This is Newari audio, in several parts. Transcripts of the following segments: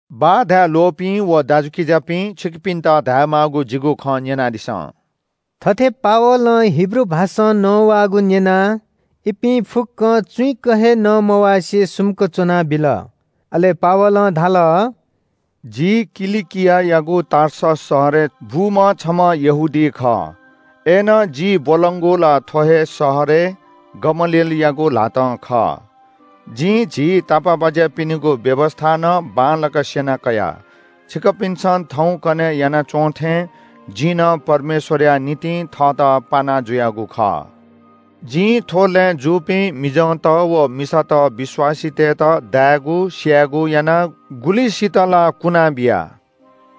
“बाः धाये ल्‍वःपिं व दाजुकिजापिं, छिकपिन्‍त धायेमाःगु जिगु खँ न्‍यनादिसँ।” थथे पावलं हिब्रू भाषां नवाःगु न्‍यनाः इपिं फुक्‍कं चुइँक हे नमवासे सुम्‍क च्‍वना बिल। अले पावलं धाल – “जि किलिकियायागु टार्सस शहरय् बूम्‍ह छम्‍ह यहूदी खः। अय्‌नं जि ब्‍वलंगु ला थ्‍व हे शहरय् गमलिएलयागु ल्‍हातं खः। जिं झी तापाःबाज्‍यापिनिगु व्‍यवस्‍था नं बांलाक स्‍यना कया। छिकपिन्‍सं थौंकन्‍हय् याना च्‍वंथें जिं नं परमेश्‍वरया निंतिं थःत पाना जुयागु खः। जिं थ्‍व लँय् जूपिं मिजंत व मिसात विश्‍वासीतय्‌त दायेगु, स्‍यायेगु याना, गुलिसित ला कुना बिया।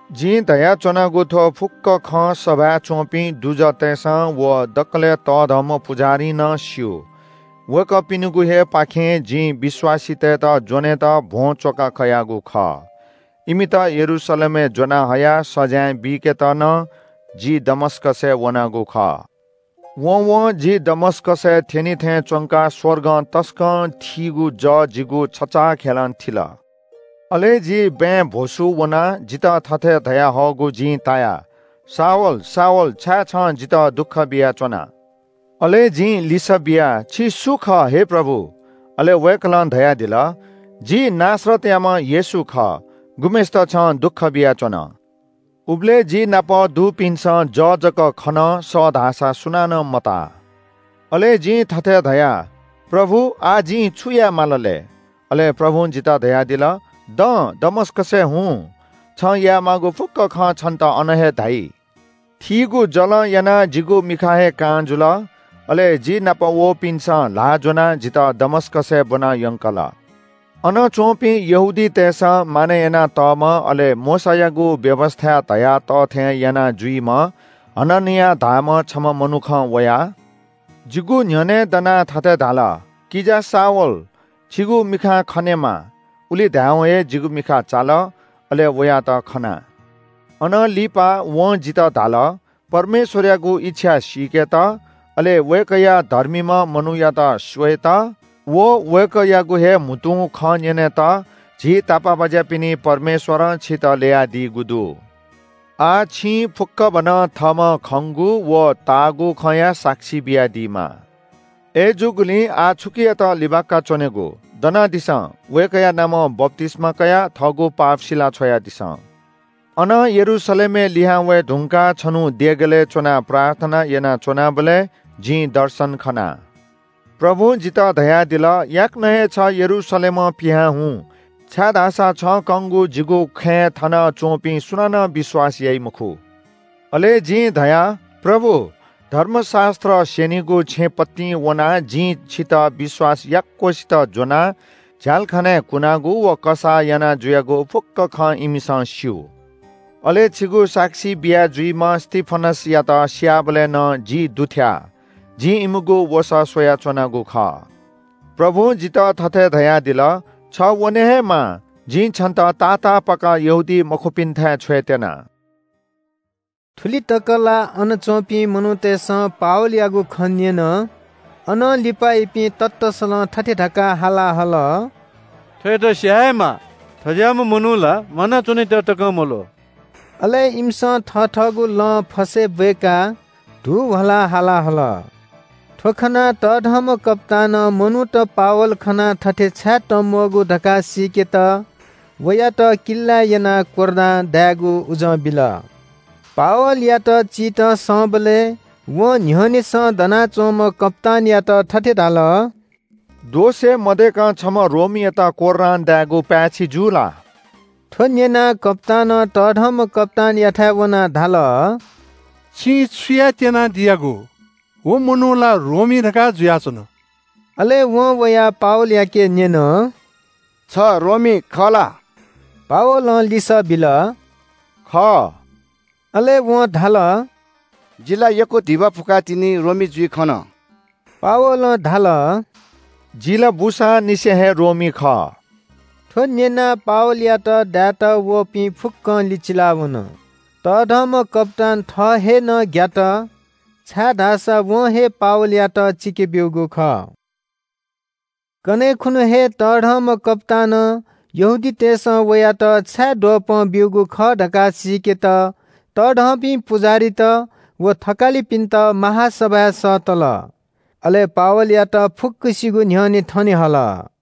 जिं धयाच्‍वनागु थ्‍व फुक्‍क खँ सभाय् च्‍वंपिं दुजःतय्‌सं व दकलय् तःधंम्‍ह पुजाहारीं नं स्‍यू। वय्‌कःपिनिगु हे पाखें जिं विश्‍वासीतय्‌त ज्‍वनेत भ्‍वं च्‍वका कयागु खः। इमित यरूशलेमय् ज्‍वनाहयाः सजाँय बीकेत नं जि दमस्‍कसय् वनागु खः।” “वँवं जि दमस्‍कसय् थ्‍यनी थें च्‍वंकाः स्‍वर्गं तसकं थीगु जः जिगु छचाःखेलं थिल। अले जि बँय् भ्‍वसू वना। जितः थथे धयाहःगु जिं ताया – ‘शाऊल, शाऊल, छाय् छं जितः दुःख बियाच्‍वना?’ “अले जिं लिसः बिया – ‘छि सु खः, हे प्रभु?’ “अले वय्‌कलं धयादिल – ‘जि नासरतयाम्‍ह येशू खः, गुम्‍हय्‌सित छं दुःख बियाच्‍वन।’ उबलय् जि नाप दुपिन्‍सं जः जक खन, सः धाःसा सुनानं मताः। “अले जिं थथे धया – ‘प्रभु, आः जिं छु याये माल लय्?’ “अले प्रभुं जितः धयादिल – ‘दँ, दमस्‍कसय् हुँ। छं यायेमाःगु फुक्‍क खँ छन्‍त अन हे धाइ।’ “थीगु जलं यानाः जिगु मिखा हे कां जुल। अले जि नाप वःपिन्‍सं ल्‍हाः ज्‍वनाः जितः दमस्‍कसय् ब्‍वनायंकल। “अन च्‍वंपिं यहूदीतय्‌सं मानय् यानातःम्‍ह अले मोशायागु व्‍यवस्‍थाय् धयातःथें यानाजुइम्‍ह हननिया धाःम्‍ह छम्‍ह मनुखं वयाः जिगु न्‍ह्यःने दनाः थथे धाल – ‘किजा शाऊल, छिगु मिखां खनेमा।’ उलि धायेवं हे जिगु मिखा चाल। अले वयात खना। “अनं लिपा वं जितः धाल – ‘परमेश्‍वरयागु इच्‍छा सीकेत, अले वय्‌कःया धर्मीम्‍ह मनूयात स्‍वयेत व वय्‌कःयागु हे म्‍हुतुं खँ न्‍यनेत झी तापाःबाज्‍यापिनि परमेश्‍वरं छितः ल्‍ययादीगु दु। आः छिं फुक्‍कभनं थःम्‍हं खंगु व ताःगु खँया साक्षी बियादीमाः। अय्‌जूगुलिं आः छुकियात लिबाका च्‍वनेगु? दनादिसँ, वय्‌कःया नामं बप्‍तिस्‍मा कयाः थःगु पाप सिला छ्वयादिसँ।’” “अनं यरूशलेमय् लिहां वये धुंकाः छन्‍हु देगलय् च्‍वनाः प्रार्थना यानाच्‍वनाबलय् जिं दर्शन खना। प्रभुं जितः धयादिल – ‘याकनं हे छ यरूशलेमं पिहां हुँ, छाय्‌धाःसा छं कंगु जिगु खँय् थनच्‍वंपिं सुनानं विश्‍वास याइ मखु।’ “अले जिं धया – ‘प्रभु, धर्मशास्‍त्र स्‍यनिगु छेँ पतिं वनाः जिं छितः विश्‍वास याक्‍वसित ज्‍वनाः झ्‍यालखानाय् कुनागु व कसाः याना जुयागु फुक्‍क खँ इमिसं स्‍यू। अले छिगु साक्षी बिया जुइम्‍ह स्‍तिफनसयात स्‍याःबलय् नं जि दुथ्‍याः, जिं इमिगु वसः स्‍वयाच्‍वनागु खः।’ “प्रभुं जितः थथे धयादिल – ‘छ वने हे माः, जिं छन्‍त तातापाक यहूदीमखुपिन्‍थाय् छ्वयेत्‍यना।’” थुलि तक ला अन च्‍वंपिं मनूतय्‌सं पावलयागु खँ न्‍यन। अनं लिपा इपिं ततःसलं थथे धकाः हाला हल – “थ्‍वयात स्‍याये हे माः। थज्‍याःम्‍ह मनू ला म्‍वानाच्‍वनेत तकं मल्‍वः।” अले इमिसं थथःगु लं फसय् ब्‍वय्‌काः धू ह्वलाः हाला हल। थ्‍व खनाः तःधंम्‍ह कप्‍तानं मनूत पावल खनाः थथे छाय् तंम्‍वःगु धकाः सीकेत वयात किल्‍लाय् यनाः कोर्रां दायेगु उजं बिल। पावलयात चित संबलय् वं न्‍ह्यःनेसं दनाच्‍वंम्‍ह कप्‍तानयात थथे धाल – “दोष हे मदय्‌कं छम्‍ह रोमीयात कोर्रां दायेगु पाय्‌छि जू ला?” थ्‍व न्‍यनाः कप्‍तानं तःधंम्‍ह कप्‍तानयाथाय् वनाः धाल – “छिं छु यायेत्‍यना दियागु? व मनू ला रोमी धकाः जुयाच्‍वन।” अले वं वयाः पावलयाके न्‍यन – “छ रोमी खः ला?” पावलं लिसः बिल – “खः।” अले वं धाल – “जि ला यक्‍व धिबा फुकाः तिनि रोमी जुइ खन।” पावलं धाल – “जि ला बूसांनिसें हे रोमी खः।” थ्‍व न्‍यनाः पावलयात दायेत वःपिं फुक्‍कं लिचिला वन। तःधंम्‍ह कप्‍तान थः हे नं ग्‍यात, छाय्‌धाःसा वं हे पावलयात चिके ब्‍यूगु खः। कन्‍हय् खुन्‍हु हे तःधंम्‍ह कप्‍तानं यहूदीतय्‌सं वयात छाय् द्वपं ब्‍यूगु खः धकाः सीकेत तःधंपिं पुजाहारीत व थकालिपिन्‍त महासभाय् सःतल। अले पावलयात फुक्‍कसिगु न्‍ह्यःने थने हल।